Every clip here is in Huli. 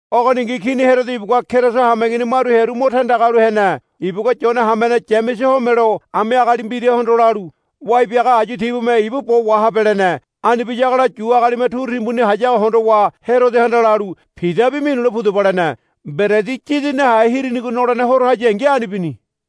Ogoningi Kini Herodo ibugua Keriso hameigini maru hearu mo tandaga halu hene. Ibugua Yonenaga hamene Yamese homelo ami agali mbirahondo lalu, Wai biaga ayu tibume ibu bo wahabe, lene. Ani biyagola Yu agalime turu timbuni hayago hondowa Herodohanda lalu, Pidabi minule pudaba, lene. Mberedi Yidi Nahe Hirinigo Nolene Horo hayangi ani bini.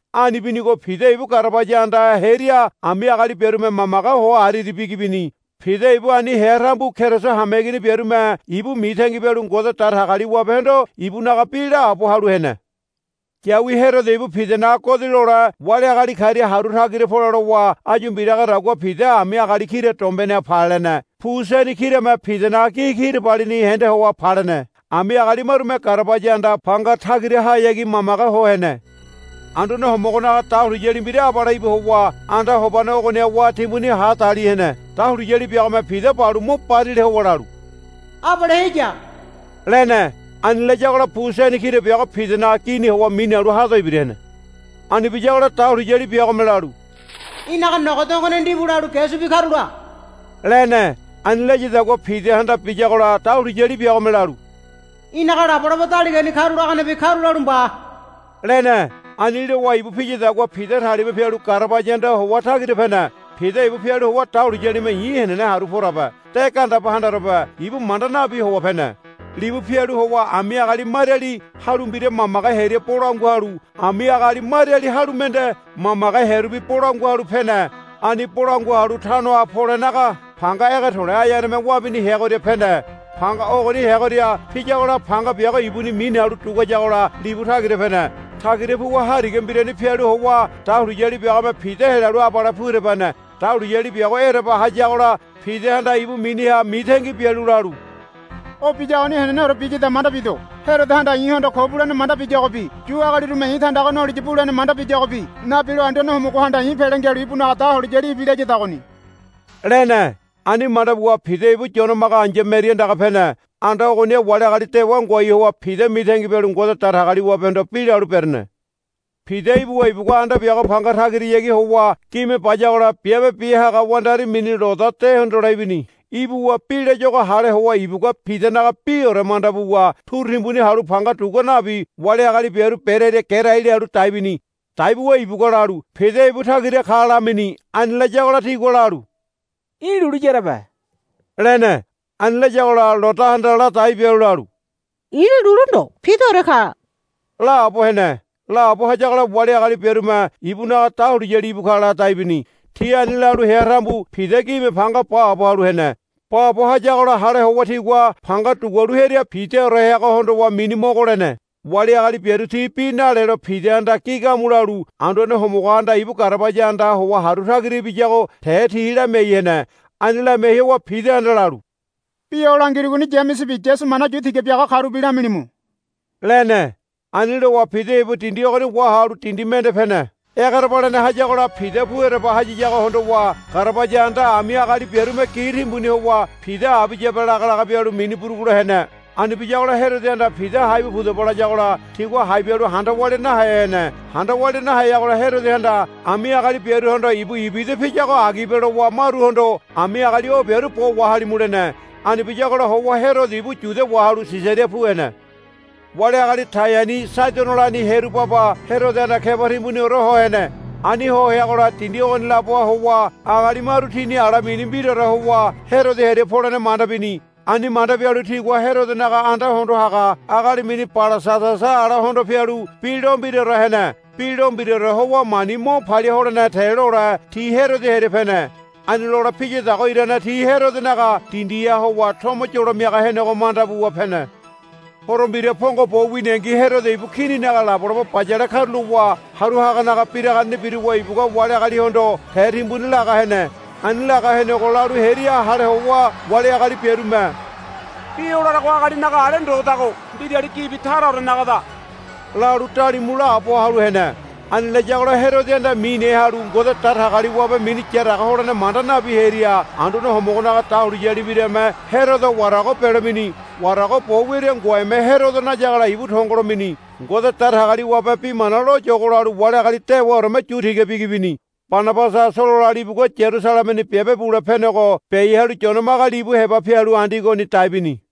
Ani binigo Pida ibu garabaya andaha hearia ami agali biarume mamage ho ariari bigi bini. Pida ibu ani hea tambu Keriso hameigini biarume ibu mitangi bialu Ngode Datagaliwabehondo ibunaga bi la haabo halu hene. Yawi Herodo ibu Pidanaga godi lole wali agali karia haru tagira pole lowa áyu mbiragadagua Pida ami agali kira dombeneha palene. Pu seni kirame Pidanaga gi kirabalini hende howa palene. Ami agali marume garabaya anda panga tagirahayagi mamage ho hene. Anduane Homogonaga dahuliyali mbira abale íbu howa anda hobane ogoniha wá timbuni hadali hene. Dahuliyali biagome Pida balu mo barila howa lalu, Abale heya, lene. Ani layagola pu seni kira biago Pidanaga gini howa minalu hado ibira hene. Ani biyagola dahuliyali biagome lalu, Í̠naga nogo dongone ndibu lalu ge subi karula, lene. Ani layadagua Pidahanda biyagola dahuliyali biagome lalu, Í̠naga labolabo daligani karulaganebi karulalu mba, lene. Ani lowa ibu piyadagua Pida talima pialu garabaya andaha howa tagira pene. Pida ibu pialu howa dahuliyalime i̱ henene haru porabe de gandeba handarobe ibu manda nabi howa pene. Libu pialu howa ami agali mariali halu mbira mamage hearia bolangua halu ami agali mariali halu mende mamage hearubi bolangua halu pene. Ani bolangua halu tanoha polenaga panga ege to̱le̱ aeaneme wabini heagoria pene. Panga ogoni heagoria piyagola panga biago ibuni minalu duguayagola libu tagira pene. Tagira puwa hariga mbirani pialu howa dahuliyali biagome Pida helalu abale pu ereba hene. Dahuliyali biago ereba hayagola Pidahanda ibu miniha mitangi bialu lalu, O biyagoni heneneore biyada manda bido. Herodohanda i̱hondo ko bulene manda biyagobi Yu agalirume i̱ tandaga noliya bulene manda biyagobi nabilo Anduane Homogohanda i̱ pele ngialu ibunaga dahuliyali ibilayadagoni, lene. Ani manda buwa Pida ibu Yone Maga ai̱ya Meri andaga pene. Anda ogoniha wali agali dewa ngoai howa Pida mitangi bialu Ngode Datagaliwabehondo bi lalu berene. Pida ibuwa ibugua anda biago panga tagirayagi howa gime bayagola biabe bia haga wandari mini Loda de hondole ibini. Ibuwa bi layuago hale howa ibugua Pidanaga biore manda buwa turu timbuni halu panga dugua nabi wali agali biaru berearia gerai lalu dai bini. Dai buwa ibugua lalu, Pida ibu tagira ka, lamini. Ani layagola tigua lalu, Í̠ lulu yarebe, lene. Ani layagola Lodahanda ladai bialu lalu, I̱ lulu ndo Pidaore ka, laabo hene. Laabo hayagola wali agali biarume, Ibunaga dahuliyali íbu ka, ladai bini. Ti ani lalu hea tambu Pida gime panga baabo halu hene. Baabo hayagola hale howa tigua panga dugualu hearia Pidaore heago hondowa mini mogo lene. Wali agali biaru ti bi nalelo Pidahanda gi gamu lalu Anduane Homogohanda ibu garabaya andaha howa haru tagira ibiyago te ti lamiai hene. Ani lamiai howa Pidahanda lalu, Bi o langirugoni Yamesebi Yasu mana yu tiga biaga karubi lamilimu, lene. Ani lowa Pida ibu dindi ogoni wahalu dindi mende pene. Egerebalene hayagola Pida pu ereba hayiyago hondowa garabaya anda ami agali biarume gi timbuni howa, Pida abiyabe, lagalaga bialu mini burugulo hene. Ani biyagola Herodohanda, Pida hai bu pudaba, layagola tigua hai bialu handa walia nahe hene. Handa walia naheyagola Herodohanda ami agali biaruhondo, Ibu ibida piyago agibe, lowa maruhondo, Ami agali o biaru bo wahalimu, lene. Ani biyagola howa Herodo ibu Yudia wahalu Sisaria pu hene. Wali agali Taiani Saidonolani hearu baba Herodohanda keba timbuniore ho hene. Ani ho heagola dindi ogoni laboha howa agali maru tini ala mini mbiraore howa Herodo hearia polene manda bini. Ani manda bialu tigua Herodonaga anda hondo haga agali mini Balasadasa ala hondo pialu bi lo mbiraore hene. Bi lo mbiraore howa mani mo palia holene te lole ti Herodo hearia pene. Ani lole piyadago irane ti Herodonaga dindiha howa tomo yolo miaga henego manda buwa pene. Horo mbira pongo bo winingi Herodo ibu kininaga labolabo bayale karulowa haru haganaga biraganeni biruwa ibugua wali agalihondo te timbuni laga hene. Ani laga henego lalu hearia hale howa wali agali biarume, Bi o larago agalinaga ale ndodago mbirali gibi taraorenagada, lalu dalimu laabo halu hene. Ani layagola Herodohanda mine halu Ngode Datagaliwabe mini yaraga holene manda nabi hearia Anduane Homogonaga dahuliyali mbirame Herodo warago belo mini. Warago bo wiaria ngoeme Herodo nayagola ibu tongolo mini. Ngode Datagaliwabe bi mana loyogo lalu wali agali dewaoreme yu tiga bigi bini. Banabasa Solola libugua Yarusalemeni biabe bule penego biai halu Yone Maga libu heba pialu Andiogoni dai bini.